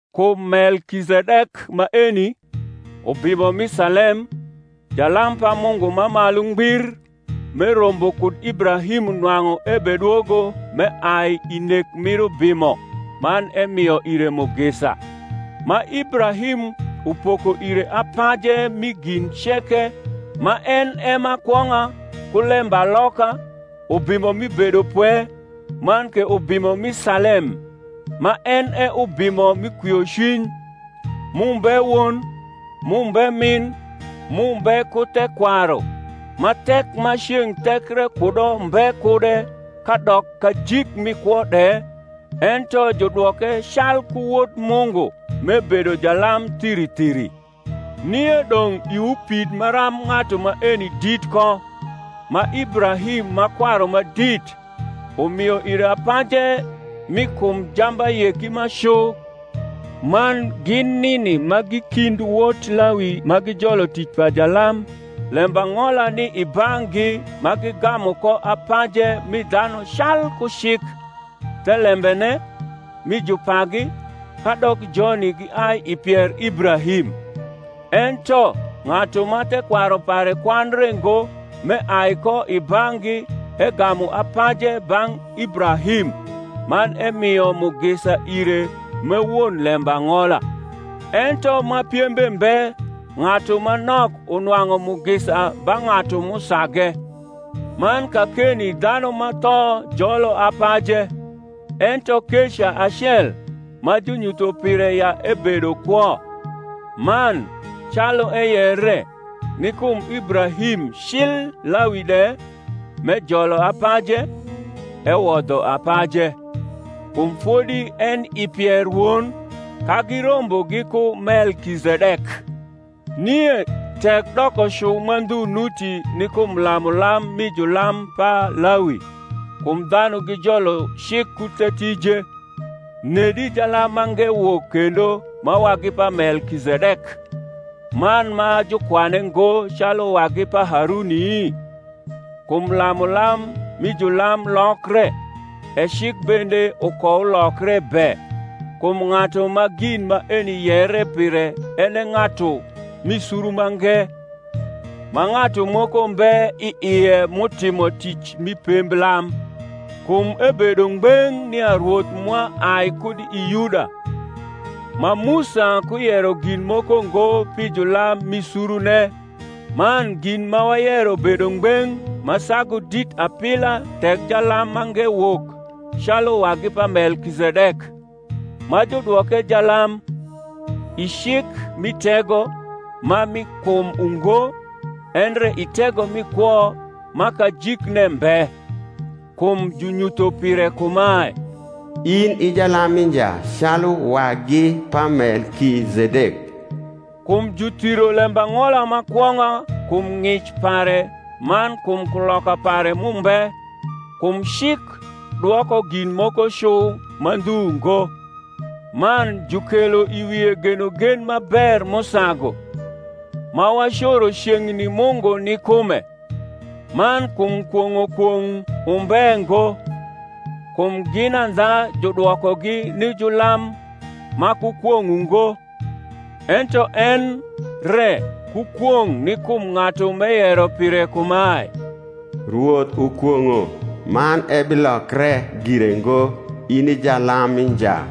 Kum Melkizedek maeni, ubimo mi Salem, jalam pa Mungu ma Malu Ngbir, m’erombo kud Ibrahim nwang’u ebedwogo m’eai i nek mir ubimo man emio ire mugisa, ma Ibrahim upoko ire apaje rni gin ceke (ma en e ma kwong’a, ku lembaloka, Ubimo mi bedopwe, man ke Ubimo mi Salem, ma en e, Ubimo mi kwiocwiny; m’umbe won, m’umbe min, m’umbe ku thekwaru, ma thek ma ceng’ thekre kudo mbe kude kadok kajik mi kwo de, ento judwoke calku Wod Mungu), m’ebedo jalam thiri thiri. Nie dong’ iwu pid maram ng’atu maeni dit ko, ma Ibrahim, ma kwaru ma dit, umio ire apaje mi kum jambayeki ma cu. Man gin nini ma gi kind wot Lawi ma gijolo tic pa jalam lembang’ola ni i bang’gi ma gigamu ko apaje mi dhanu calku cik, thelembene, mi jupagi, kadok joni giai i pier Ibrahim: ento ng’atu ma thekwaru pare kwandre ngo m’eai ko i bang’gi egamu apaje bang’ Ibrahim, man emio mugisa ire m’e won lembang’ola. Ento ma piembe mbe ng’atu ma nok unwang’u mugisa ba ng’atu m’usage. Man kakeni dhanu ma tho jolo apaje; ento keca acel, ma junyutho pire ya ebedo kwo. Man, calu eyere, ni kum Ibrahim cil Lawi de, m’ejolo apaje, ewodho apaje; kum fodi eni i pier won, ka girombo giku Melkizedek. Nie tek dokocu ma ndhu nuti ni kum lamulam mi julam pa Lawi (kum dhanu gijolo cik ku the tije), nedi jalam mange wok kendo ma wagi pa Melkizedek, man ma jukwane ngo calu wagi pa Haruni? Kum lamulam mi julam lokre, e cik bende ukoulokre be. Kum ng’atu ma gin maeni yere pire en e ng’atu m’i suru mange, ma ng’atu moko mbe i ie m’utimo tic mi pemblam. Kum ebedo ngbeng’ nia Rwoth mwa ai kud i Yuda; ma Musa kuyero gin moko ngo pi julam mi surune. Man gin ma wayero bedo ngbeng’ ma sagu dit apila tek jalam mange wok calu wagi pa Melkizedek, ma judwoke jalam, i cik mi tego ma mi kum ungo, endre i tego mi kwo ma kajikne mbe: kum junyutho pire kumae, In i jalam mi nja Calu wagi pa Melkizedek. Kum juthiro lembang’ola ma kwong’a kum ng’ic pare man kum kuloka pare m’umbe (kum cik dwoko gin moko cu ma ndhu ngo), man jukelo i wie genogen ma ber m’usagu, ma wacoro ceng’ni Mungu ni kume. Man kum kwong’o kwong’ umbe ngo (kum gin andha judwokogi ni julam ma ku kwong’ ungo; ento en re ku kwong’ ni kum ng’atu m’eyero pire kumae, Rwoth ukwong’o man ebilokre gire ngo, In i jalam mi nja);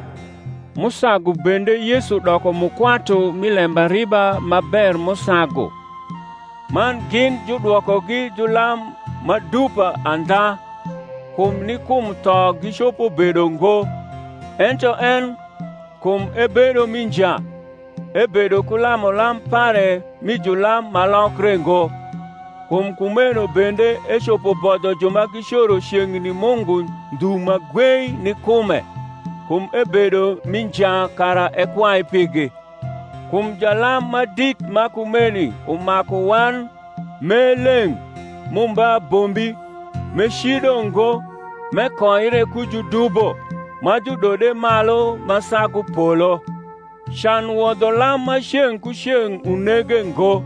m’usagu bende Yesu doko mukwatu mi lembariba ma ber m’usagu. Man gin judwokogi julam ma dupa andha, kum ni kum tho gicopo bedo ngo: ento en, kum ebedo mi nja, ebedo ku lamulam pare rni julam ma lokre ngo. Kum kumeno bende ecopo bodho ju ma gicoro ceng’ni Mungu ndhu ma gwei ni kume, kum ebedo mi nja kara ekwai pigi. Kum jalam ma dit ma kumeni umaku wan, m’e leng’, m’umbe abombi, m’ecido ngo, m’ekoire ku judubo, ma judode malu ma sagu polo; can wodho lam ma ceng’ ku ceng’ unege ngo,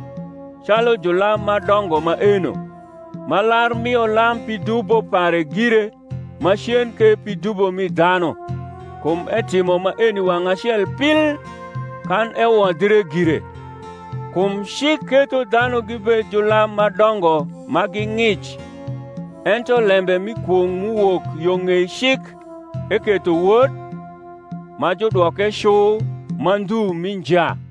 calu julam ma dongo maeno, ma lar mio lam pi dubo pare gire, macen ke pi dubo mi dhanu: kum etimo maeni wang’ acel pil, kan ewodhre gire. Kum cik ketho dhanu gibed julam ma dongo ma gi ng’ic; ento lembe mi kwong’ m’uwok yo ng’ei cik, eketho Wod, ma judwoke cu ma ndhu mi nja.